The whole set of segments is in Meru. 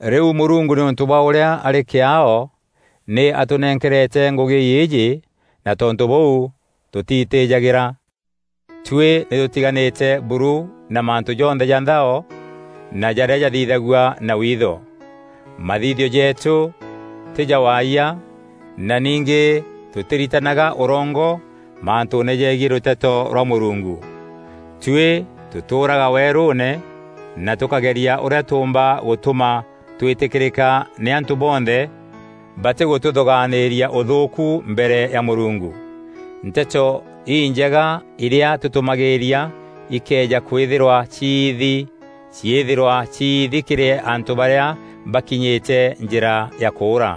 Rîu Mûrungu nîûntû bwa ûrîa arî kîaao, nî atûnenkerete ngûgî îîjî na tontû bûu tûtiitîjagîra. Tuî nî tûtiganîte buru na mantû jonthe ja nthao na jarîa jathithagua na witho. Mathithio jeetû tî ja waayia na ningî tûtîritanaga ûrongo mantûûne jegiî rûteto rwa Mûrungu. Tuî tûtûûraga weerûûne na tûkageria ûrîa tûûmba gûtûma twîtîkîrîka nî antû bonthe batîgûtûthûgaanîria ûthûûku mbere ya Mûrungu. Nteto Injega irîa tûtûmagîîria ikëeja kwîthîrwa ciithi, ciîthîrwa ciithi kîrî antû barîa bakinyîte njîra ya kûûra.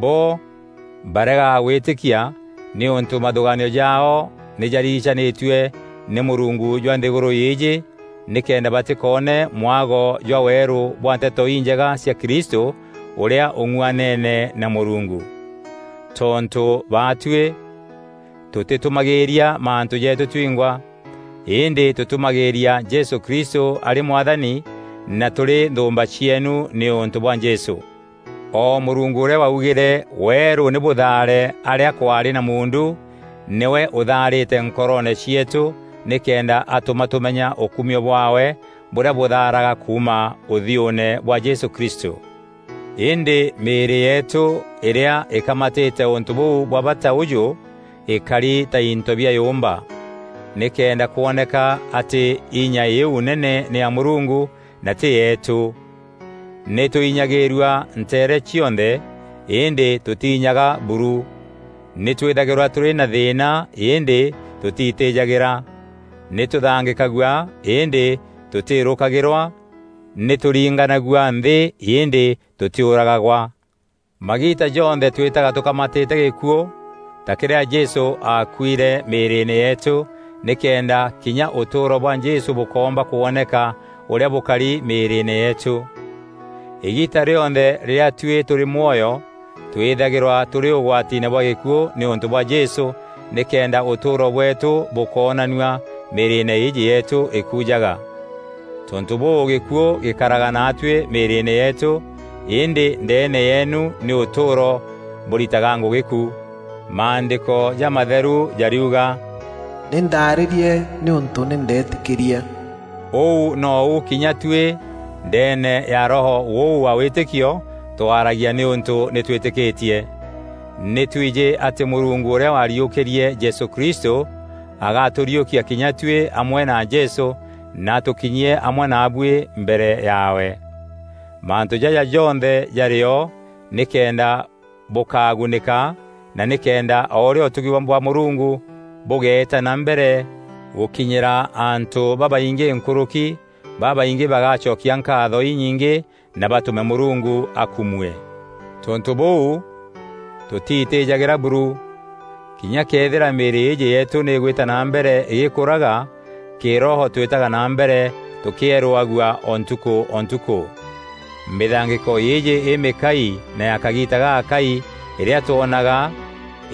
Bo baregaga gwîtîkia nîûntû mathûgaanio jaao nî jarigicanîtue nî mûrungu jwa nthîgûrû îîjî nîkenda batîkoone mwago jwa weerû bwa Nteto Injega cia Kristû, ûrîa ûng'uaneene na Mûrungu. Tontû baatuî tûtîtûmagîîria mantû jeetû twingwa, îndî tûtûmagîîria Jesû Kristû arî Mwathani, na tûrî nthûûmba cieenu nîûntû bwa Jesû. O Mûrungu ûrîa waugîre, “Weerû nî bûthaare arîa kwaarî na muundu,” nîwe ûthaarîte nkoroone cieetû nîkenda atûma tûmenya ûkumio bwaawe bûrîa bûthaaraga kuuma ûthiûûne bwa Jesû Kristû. Îndî mîîrî yeetû îrîa îkamatîte ûntû bûu bwa bata ûjû îkari ta into bia yûûmba, nîkenda kwoneka atî inya îîu nene nî ya Mûrungu, na tî yeetû. Nî tûinyagîîrua nteere cionthe, îndî tûtiinyaga buru; nî twîthagîrwa tûrî na thîîna îndî tûtiitîjagîra; nî tûthangîkagua îndî tûtîîrûkagîrwa; nî tûringanagua nthî îndî tûtîûragagwa. Magiita jonthe twîtaga tûkamatîte gîkuû ta kîrîa Jesû aakuîre mîîrîîne yeetû nîkenda kinya ûtûûro bwa Jesû bûkoomba kwoneka ûrîa bûkari mîîrîîne yeetû. Îgiita rîonthe rîrîa tuî tûrî mwoyo, twîthagîrwa tûrî ûgwatiine bwa gîkuû nîûntû bwa Jesû nîkenda ûtûûro bweetû bûkoonanua mîîrîîne îîjî yeetû îkujaga. Tontû bûû gîkuû gîkaraga naatuî mîîrîîne yeetû, îndî ndeene yeenu nî ûtûûro bûritaga ngûgî ku. Maandîko jamatheru jariuga, “Nî ndaarîrie nîûntû nî ndeetîkîrie.” Ûu nou kinya tuî ndeene ya Roho ûu wa wîtîkio twaragia nîûntû nî twîtîkîtie. Nî twijî atî Mûrungu ûrîa wariûkîrie Jesû Kristû, agatûriûkia kinya tuî amwe na Jesû na atûkinyie amwe naabuî mbere yaawe. Mantû jaja jonthe jarîo nîkenda bûkagunîka na nîkenda o ûrîa ûtugi bwa Mûrungu bûgeeta na mbere gûkinyîra antû babaingî nkûrûki, babaingî bagacokia nkaatho inyingî na batûme Mûrungu akumue. Tontû bûu tûtiitîjagîra buru. Kinya këethîra mîîrî îîjî yeetû nî îgwîta na mbere îgîkûraga, kîroho twîtaga na mbere tûkîerûagua o ntukû o ntukû. Mîthangîko îîjî îmîkai na ya kagiita gagakai îrîa twoonaga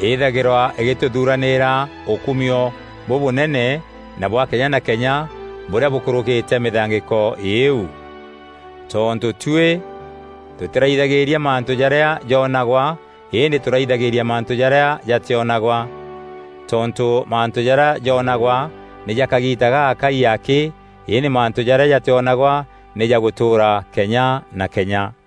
îîthagîrwa îgîtûthuranîîra ûkumio bûbûnene na bwa kenya na kenya bûrîa bûkûrûkîte mîthangîko îîu. Tontû tuî tûtîraithagîîria mantû jarîa joonagwa îndî tûraithagîîria mantû jarîa jatîonagwa. Tontû mantû jarîa joonagwa nî ja kagiita gagakai akî îndî mantû jarîa jatîonagwa nî ja gûtûûra kenya na kenya.